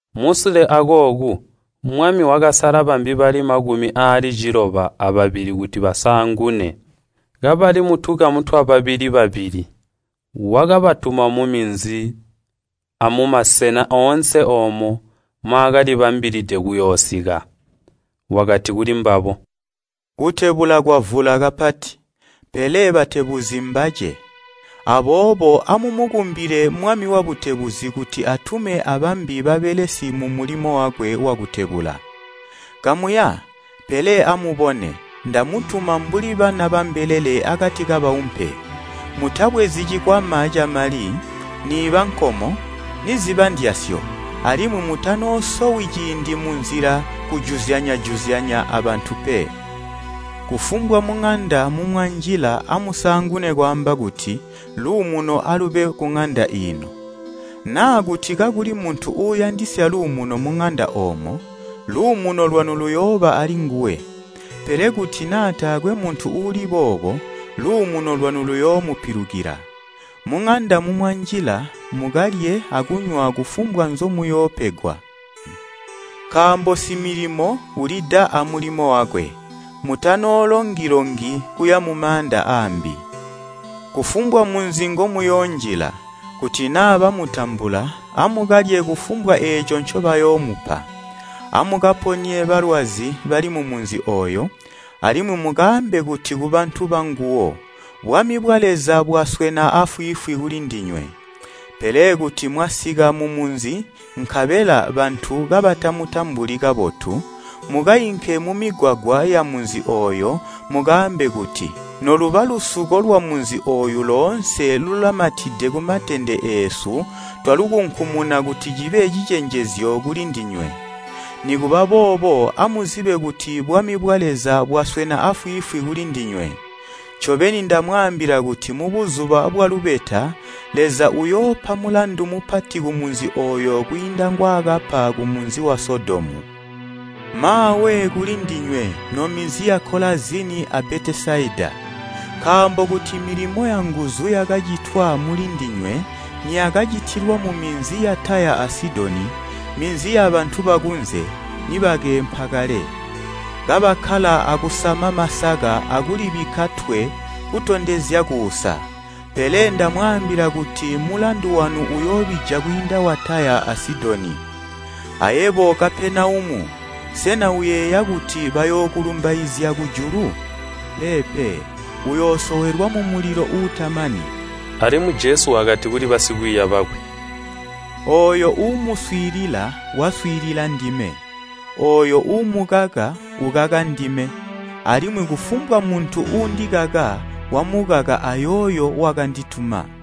Musule akooku, Mwami wakasala bambi bali makumi aali ciloba ababili kuti basaangune, kabali mutukamu twababili babili. Wakabatuma muminzi amumasena oonse oomo mwaakalibambilide kuyoosika. Wakati kulimbabo, “Kutebula kwavula kapati, pele batebuzi mbace. Aboobo amumukumbile Mwami wabutebuzi kuti atume abambi babelesi mumulimo wakwe wakutebula. Kamuya! Pele amubone, ndamutuma mbuli bana bambelele akati kabaumpe. Mutabwezi cikwama camali, niiba nkomo, niziba ndyasyo, alimwi mutanoosowi ciindi munzila kujuzyanya abantu pe. Kufumbwa muŋanda mumwanjila amusaangune kwaamba kuti, ‘Luumuno alube kuŋanda iino.’ Naa kuti kakuli muntu uuyandisya luumuno muŋanda oomo, luumuno lwanu luyooba alinguwe, pele kuti naa taakwe muntu uuli boobo, luumuno lwanu luyoomupilukila. Muŋanda mumwanjila, mukalye akunywa kufumbwa nzomuyoopegwa. Nkaambo similimo ulida amulimo wakwe. Mutanoolongi-longi kuya mumaanda aambi. Kufumbwa munzi ngomuyoonjila, kuti naa bamutambula, amukalye kufumbwa eeco ncobayoomupa. Amukaponye balwazi bali mumunzi ooyo, alimwi mukaambe kuti ku bantu banguwo, ‘Bwami bwa Leza bwaswena afwiifwi kulindinywe.’ Pele kuti mwasika mumunzi, nkabela bantu kabatamutambuli kabotu, mukainke mumigwagwa yamunzi ooyo mukaambe kuti, ‘Noluba lusuko lwamunzi ooyu loonse lulamatide kumatende eesu twalukunkumuna kuti cibe cicenjezyo kulindinywe. Nikuba boobo amuzibe kuti bwami bwa Leza bwaswena afwiifwi kulindinywe!’ Ncobeni ndamwaambila kuti mubuzuba bwalubeta Leza uyoopa mulandu mupati kumunzi ooyo kwiinda ngwaakapa kumunzi wa Sodomu! “Maawe kulindinywe, nominzi ya Kolazini a Betesaida! Nkaambo kuti milimo yanguzu yakacitwa mulindinywe niyakacitilwa muminzi ya Taya a Sidoni, minzi yabantu bakunze, nibakeempa kale, kabakkala akusama masaka akulibikka twe kutondezya kuusa. Pele ndamwaambila kuti mulandu wanu uyoobija kwiinda wa Taya a Sidoni! Ayebo Kapenaumu! Sena uyeeya kuti bayookulumbaizya kujulu? Peepe, uyoosowelwa mumulilo uutamani.” Alimwi Jesu wakati kuli basikwiiya bakwe, “Ooyo uumuswiilila, waswiilila ndime, ooyo uumukaka ukaka ndime, alimwi kufumbwa muntu uundikaka, wamukaka ayooyo wakandituma.”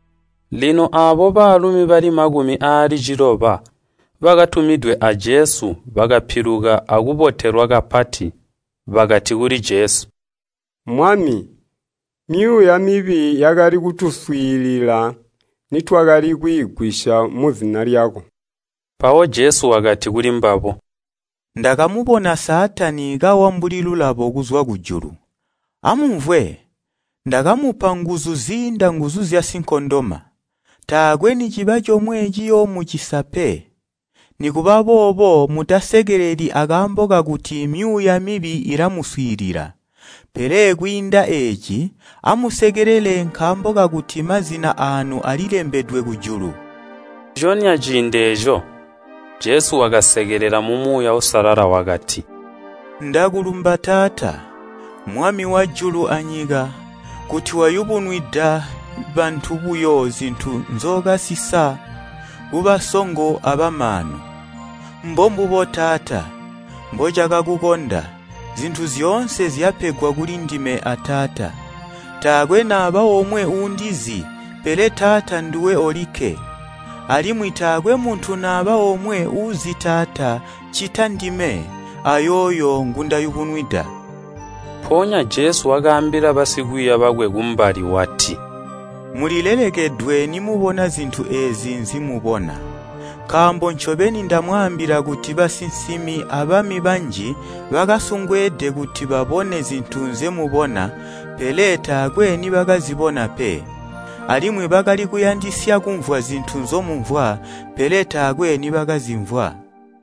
Lino aabo baalumi bali makumi aali ciloba bakatumidwe a Jesu bakapiluka akubotelwa kapati. Bakati kuli Jesu, “Mwami, myuuya mibi yakali kutuswiilila nitwakali kwiigwisya muzina lyako!” Mpawo Jesu wakati kulimbabo, “Ndakamubona Saatani kawa mbuli lulabo kuzwa kujulu. Amumvwe! Ndakamupa nguzu ziinda nguzu zyasinkondoma. Taakwe niciba comwe ciyoomucisa pe. Nikubaboobo mutasekeleli akaambo kakuti myuuya mibi ilamuswiilila, pele kwiinda eeci, amusekelele nkaambo kakuti mazina aanu alilembedwe kujulu.” Nciconya ciindi eeco, Jesu wakasekelela mu Muuya Uusalala wakati, “Ndakulumba Taata, Mwami wajulu anyika kuti wayubunwida bantu buyo zintu nzookasisa kubasongo abamaanu. Mbombubo, Taata, mbocakakukonda! “Zintu zyoonse zyapegwa kuli ndime a Taata. Taakwe naba omwe uundizi, pele Taata nduwe olikke. Alimwi taakwe muntu naba omwe uuzi Taata ccita ndime, ayooyo ngundayubunwida.” Mpoonya Jesu wakaambila basikwiiya bakwe kumbali, wati, “Mulilelekedwe nimubona zintu eezi nzimubona! Nkaambo ncobeni ndamwambila kuti basinsimi abami banji bakasungweede kuti babone zintu nzemubona pele taakwe nibakazibona pe, alimwi bakali kuyandisya kumvwa zintu nzomumvwa, pele taakwe nibakazimvwa.”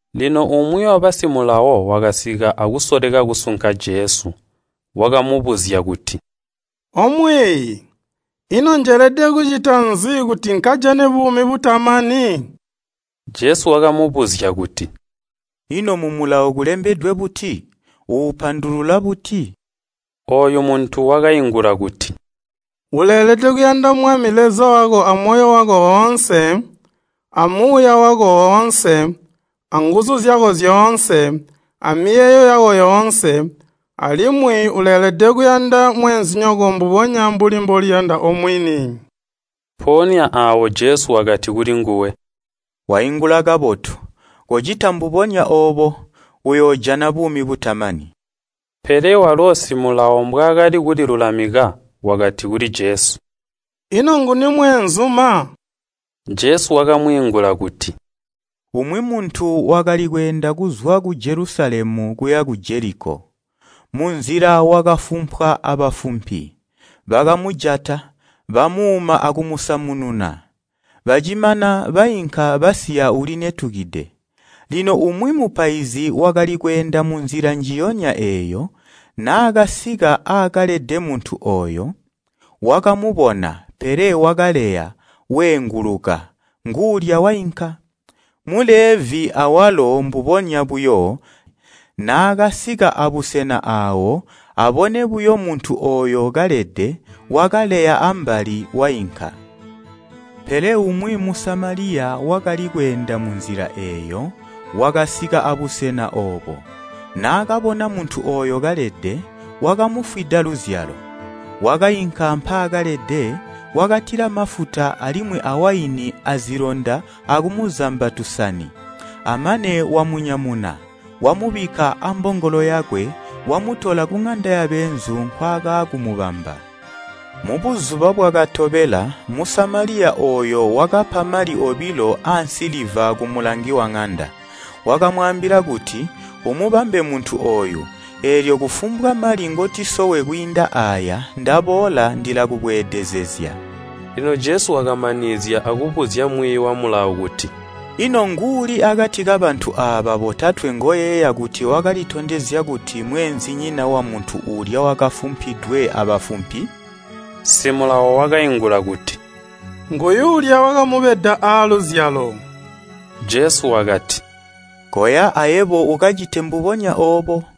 Lino umwi mwiiyi wa Mulawo wakasika akusoleka kusunka Jesu. Wakamubuzya kuti, “O Mwiiyi, ino njelede kucita nzi kuti nkajane buumi butamani?” Jesu wakamubuzya kuti, “Ino mu Mulawo kulembedwe buti? Uupandulula buti?” Ooyu muntu wakaingula kuti, “‘Uleelede kuyanda Mwami Leza wako amoyo wako woonse, amuuya wako woonse, nguzu zyako zyoonse, amiyeeyo yako yoonse,’ alimwi ‘Uleelede kuyanda mweenzinyoko mbubonya mbuli mboliyanda omwini.’” Mpoonya aawo Jesu wakati kulinguwe, “Waingula kabotu, kocita mbubonya oobo, uyoojana buumi butamani.” Pele walo mwiiyi wa Mulawo mbwaakali kulilulamika wakati kuli Jesu, “Ino nguni mweenzuma?” Jesu wakamwiingula kuti, “Umwi muntu wakali kweenda kuzwa ku Jelusalemu kuya ku Jeliko. Munzila wakafumpwa abafumpi, bakamujata, bamuuma akumusamununa. Bacimana bainka basiya ulinetukide. Lino umwi mupaizi wakali kweenda munzila njiyonya eeyo, naakasika aakalede muntu ooyo, wakamubona, pele wakaleya, weenguluka, nguulya wainka. Mulevi awalo mbubonya buyo, naakasika abusena aawo, abone buyo muntu ooyo kalede, wakaleya ambali, wainka. “Pele umwi Musamaliya wakali kweenda munzila eeyo, wakasika abusena oobo. Naakabona muntu ooyo kalede, wakamufwida luzyalo. Wakainka mpaakalede, wakatila mafuta alimwi awaini azilonda akumuzamba tusani, amane wamunyamuna, wamubikka ambongolo yakwe, wamutola kuŋanda yabeenzu nkwaakaakumubamba. “Mubuzuba bwakatobela, Musamaliya ooyo wakapa mali obilo aansiliva kumulangi waŋanda. Wakamwaambila kuti, ‘Umubambe muntu ooyu, eelyo kufumbwa mali ngotisowe kwiinda aaya ndaboola ndilakubweedezezya.’” Lino Jesu wakamanizya akubuzya mwiiyi wa Mulawo kuti, “Ino nguuli akati kabantu aaba botatwe ngoyeeya kuti wakalitondezya kuti mweenzinyina wamuntu uulya wakafumpidwe abafumpi?” Mwiiyi wa Mulawo wakaingula kuti, “Nguyuulya wakamubeda aaluzyalo.” Jesu wakati, “Koya, ayebo ukacite mbubonya oobo.”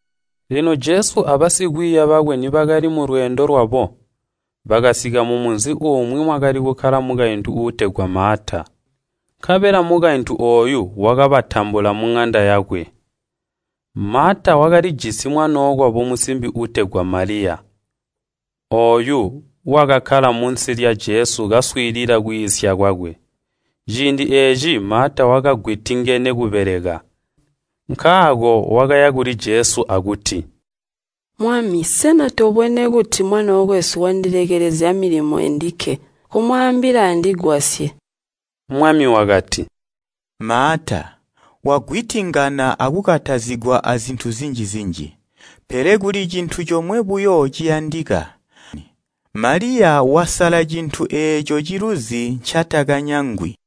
Lino Jesu abasikwiiya bakwe nibakali mulweendo lwabo, bakasika mumunzi umwi mwakali kukkala mukaintu uutegwa Maata. Nkabela mukaintu ooyu wakabatambula muŋanda yakwe. Maata wakalijisi mwanookwabo musimbi uutegwa Maliya, ooyu, wakakkala munsi lya Jesu kaswiilila kwiisya kwakwe. Ciindi eeci Maata wakagwitingene kubeleka. Nkaako wakaya kuli Jesu akuti, “Mwami, sena tobwene kuti mwanookwesu wandilekelezya milimo endike? Komwaambila andigwasye.” Mwami wakati, “Maata, wagwitingana akukatazigwa azintu zinji-zinji. Pele kuli cintu comwe buyo ciyandika. Maliya wasala cintu eeco ciluzi, ncatakanyangwi.”